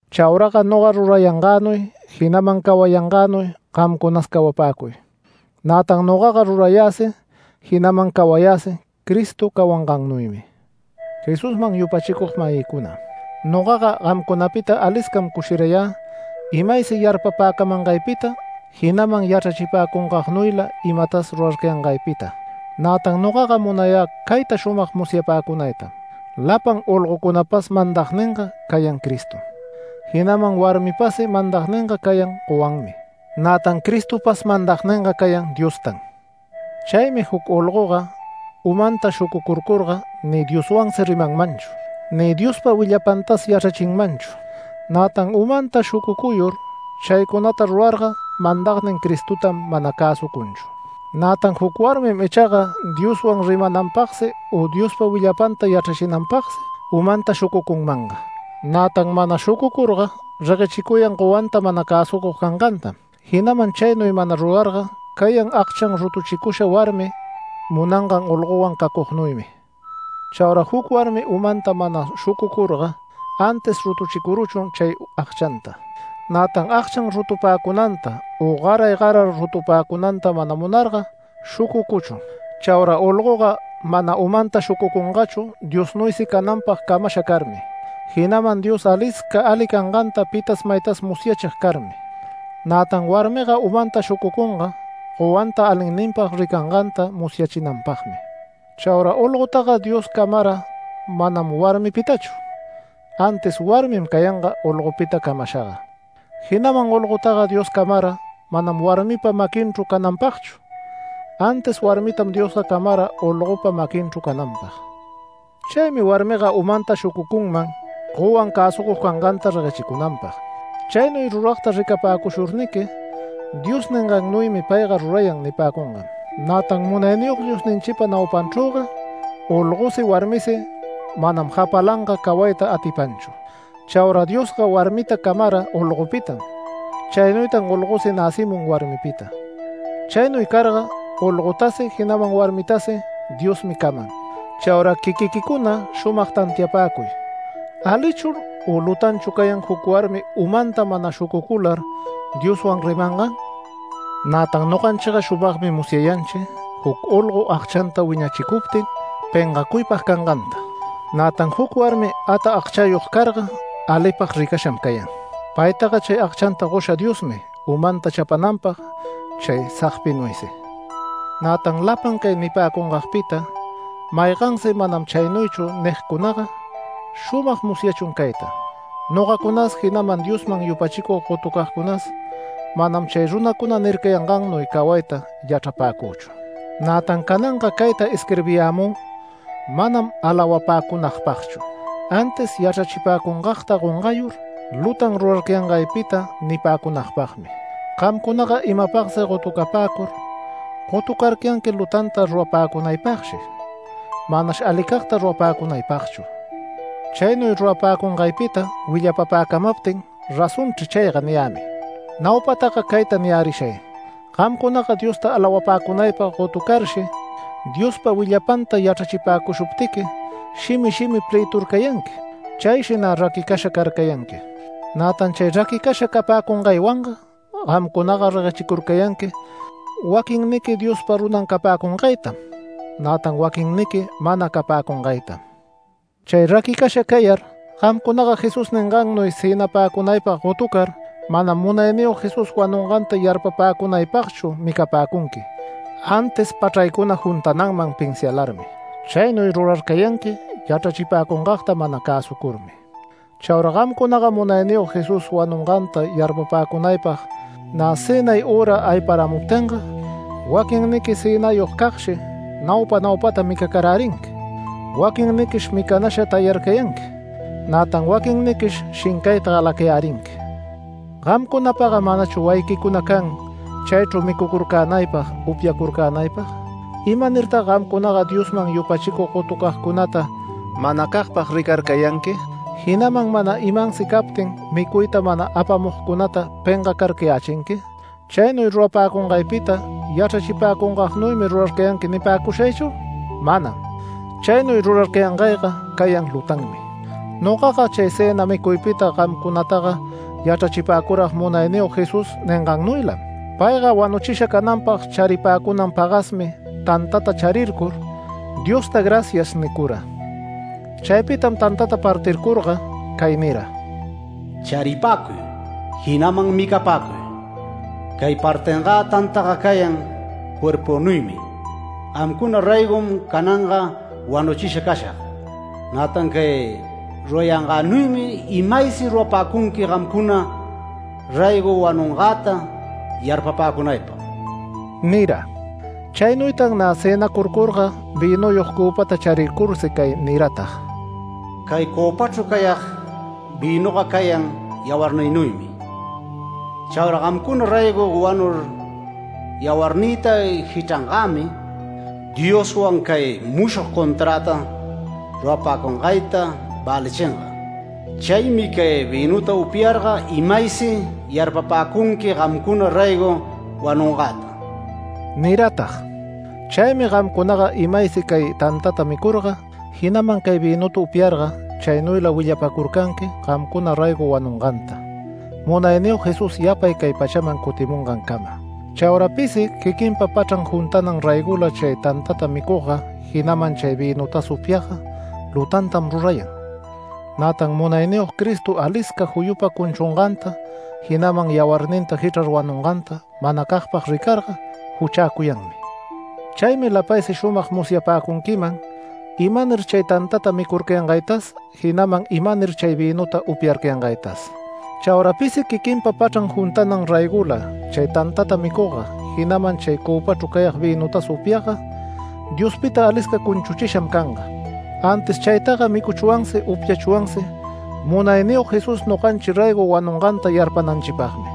Chauraga noga rurayangänuy, jinaman cawayangänuy gamcunas cawapäcuy. Nätan nogaga rurayäsi, jinaman cawayäsi Cristo cawangannuymi. Jesusman yupachicug-mayïcuna, nogaga gamcunapita aliscam cushirayä imaysi yarpapäcamangaypita, jinaman yachrachipäcungagnuyla imatas rurarcayangaypita. Nätan nogaga munayä cayta shumag musyapäcunaytam: Lapan olgocunapas mandagninga cayan Cristom, jinaman warmipasi mandagninga cayan gowanmi. Nätan Cristopas mandagninga cayan Diostam. Chaymi juc olgoga umanta shucucuyurga ni Dioswansi rimanmanchu, ni Diospa willapantas yachrachinmanchu. Nätan umanta shucucuyur chaycunata rurarga mandagnin Cristotam mana cäsucunchu. Nätan juc warmim ichaga Dioswan rimananpagsi u Diospa willapanta yachrachinanpagsi umanta shucucunmanga. Nätan mana shucucurga reguechicuyan gowanta mana cäsucug cangantam, jinaman chaynuy mana rurarga cayan agchan rutuchicusha warmi munangan olgowan cacugnuymi. Chaura juc warmi umanta mana shucucurga antis rutuchicuruchun chay agchanta. Nätan agchan rutupäcunanta u garay garar rutupäcunanta mana munarga shucucuchun. Chaura olgoga mana umanta shucucungachu Diosnuysi cananpag camasha carmi, jinaman Dios alisca ali canganta pita maytas musyachig carmi. Nätan warmiga umanta shucucunga gowanta alinninpag ricanganta musyachinanpagmi. Chaura olgotaga Dios camara manam warmipitachu, antis warmin cayanga olgopita camashaga. Jinaman olgotaga Dios camara manam warmipa maquinchru cananpagchu, antis warmitam Diosga camara olgopa maquinchru cananpag. Chaymi warmiga umanta shucucunman gowan cäsucug canganta reguechicunanpag. Chaynuy ruragta ricapäcushurniqui Dios ningannuymi payga rurayan nipäcungam. Nätan Munayniyog Diosninchipa naupanchrüga olgosi warmisi manam japalanga cawayta atipanchu. Chaura Diosga warmita camara olgopitam. Chaynuytan olgosi näcimun warmipita. Chaynuy carga olgotasi, jinaman warmitasi Diosmi caman. Chaura quiquiquicuna shumag tantiapäcuy ¿alichu u lutanchu cayan juc warmi umanta mana shucucular Dioswan rimangan? Nätan noganchiga shumagmi musyayanchi juc olgo agchanta wiñachicuptin pengacuypag canganta. Nätan juc warmi ata agchayog carga alipag ricasham cayan. Paytaga chay agchanta gosha Diosmi umanta chapananpag chay sagpinuysi. Nätan lapan cay nipäcungagpita maygansi “Manam chaynuychu” nigcunaga, shumag musyachun cayta: Nogacunas, jinaman Diosman yupachicug gotucagcunas manam chay runacuna nircayangannuy cawayta yachrapäcüchu. Nätan cananga cayta isquirbiyämü manam alawapäcunagpagchu, antis yachrachipäcungagta gongayur lutan rurarcayangaypita nipäcunagpagmi. Gamcunaga imapagsi gotucapäcur, gotucarcayanqui lutanta rurapäcunaypagshi, manash alicagta rurapäcunaypagchu. Chaynuy rurapäcungaypita willapapäcamaptin “Razonchri chayga” niyämi. Naupataga cayta niyärishay: Gamcunaga Diosta alawapäcunaypag gotucarshi, Diospa willapanta yachrachipäcushuptiqui shimi shimi plëturcayanqui. Chayshi nä raquicasha carcayanqui. Nätan chay raquicasha capäcungaywanga gamcunaga reguechicurcayanqui waquinniqui Diospa runan capäcungaytam, nätan waquinniqui mana capäcungaytam. Chay raquicasha cayar gamcunaga Jesús ningannuy cënapäcunaypag gotucar manam Munayniyog Jesús wanunganta yarpapäcunaychu micapäcunqui, antis pachraycuna juntananman pinsialarmi. Chaynuy rurarcayanqui yachrachipäcungagta mana cäsucurmi. Chaura gamcunaga Munayniyog Jesús wanunganta yarpapäcunaypag nä cënay üra ayparamuptinga waquinniqui cënayogcagshi naupa naupata micacarärinqui. Waquinniquish micanasha tayarcayanqui, nätan waquinniquish shincayta galacayärinqui. ¿Gamcunapaga manachu wayiquicuna can chaychru micucurcänaypag, upyacurcänaypag? ¿Imanirtag gamcunaga Diosman yupachicug gotucagcunata manacagpag ricarcayanqui, jinaman mana imansi captin micuyta mana apamugcunata pengacarcayächinqui? ¿Chaynuy rurapäcungaypita yachrachipäcungagnuymi rurarcayanqui nipäcushaychu? ¡Manam! Chaynuy rurarcayangayga cayan lutanmi. Nogaga chay cëna micuypita gamcunataga yachrachipäcurag Munayniyog Jesús ningannuylam. Payga wanuchisha cananpag charipäcunan pagasmi tantata charircur, Diosta “Gracias” nicura. Chaypitam tantata partircurga cay nira: “Charipäcuy, jinaman micapäcuy. Cay partingä tantaga cayan cuerpünuymi, gamcuna raygom cananga wanuchisha cashag. Nätan cay rurayangänuymi imaysi rurapäcunqui gamcuna raygo wanungäta yarpapäcunaypag” nira. Chaynuytan nä cënacurcurga vïnuyog cöpata charircursi cay niratag: “Cay cöpachru cayag vïnuga cayan yawarnïnuymi. Chaura gamcuna raygo wanur yawarnïta jichrangämi, Dioswan cay mushog conträta rurapäcungayta välichinga. Chaymi cay vïnuta upyarga imaysi yarpapäcunqui gamcuna raygo wanungäta” niratag. Chaymi gamcunaga imaysi cay tantata micurga, jinaman cay vïnuta upyarga chaynuyla willapacurcanqui gamcuna raygo wanunganta, Munayniyog Jesús yapay cay pachaman cutimungancama. Chaura pisi quiquinpa pachran juntanan raygola chay tantata micugga, jinaman chay vïnutas upyagga lutantam rurayan, nätan Munayniyog Cristo alisca juyupa cunchunganta, jinaman yawarninta jichrar wanunganta manacagpag ricarga juchäcuyanmi. Chaymi lapaysi shumag musyapäcunquiman imanir chay tantata micurcayangaytas, jinaman imanir chay vïnuta upyarcayangaytas. Chaura pisi quiquinpa pachran juntanan raygola chay tantata micugga, jinaman chay cöpachru cayag vïnutas upyagga Diospita alisca cunchuchisham canga. Antis chaytaga micuchwansi upyachwansi Munayniyog Jesús noganchi raygo wanunganta yarpananchipagmi.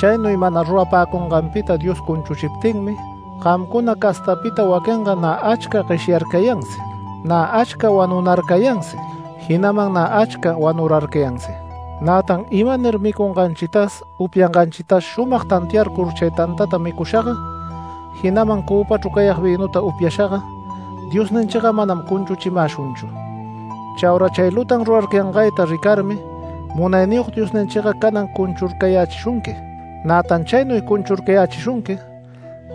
Chaynuy mana rurapäcunganpita Dios cunchuchiptinmi gamcuna castapita waquinga nä achca gueshyarcayansi, nä achca wanunarcayansi, jinaman nä achca wanurarcayansi. Nätan imanir micunganchitas upyanganchitas shumag tantiacuyur chay tantata micushaga, jinaman cöpachru cayag vïnuta upyashaga, Diosninchiga manam cunchuchimäshunchu. Chaura chay lutan rurarcayangayta ricarmi Munayniyog Diosninchiga canan cunchurcayächishunqui. Nätan chaynuy cunchurcayächishunqui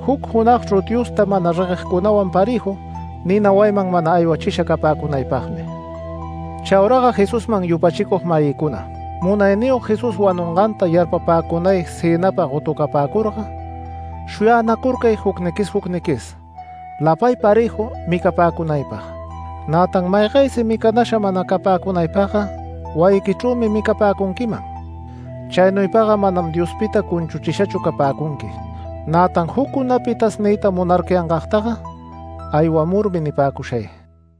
juc junagchru Diosta mana reguegcunawan parëju nina wayiman mana aywachisha capäcunaypagmi. Chauraga Jesusman yupachicug-mayïcuna, Munayniyog Jesús wanunganta yarpapäcunay cënapag gotucapäcurga, shuyänacurcay jucniquis jucniquis lapay parëju micapäcunaypag. Nätan maygaysi micanasha mana capäcunaypagga wayiquichrümi micapäcunquiman. Chaynuypaga manam Diospita cunchuchishachu capäcunqui. Nätan juccunapitas niyta munarcayangagtaga aywamurmi nipäcushay.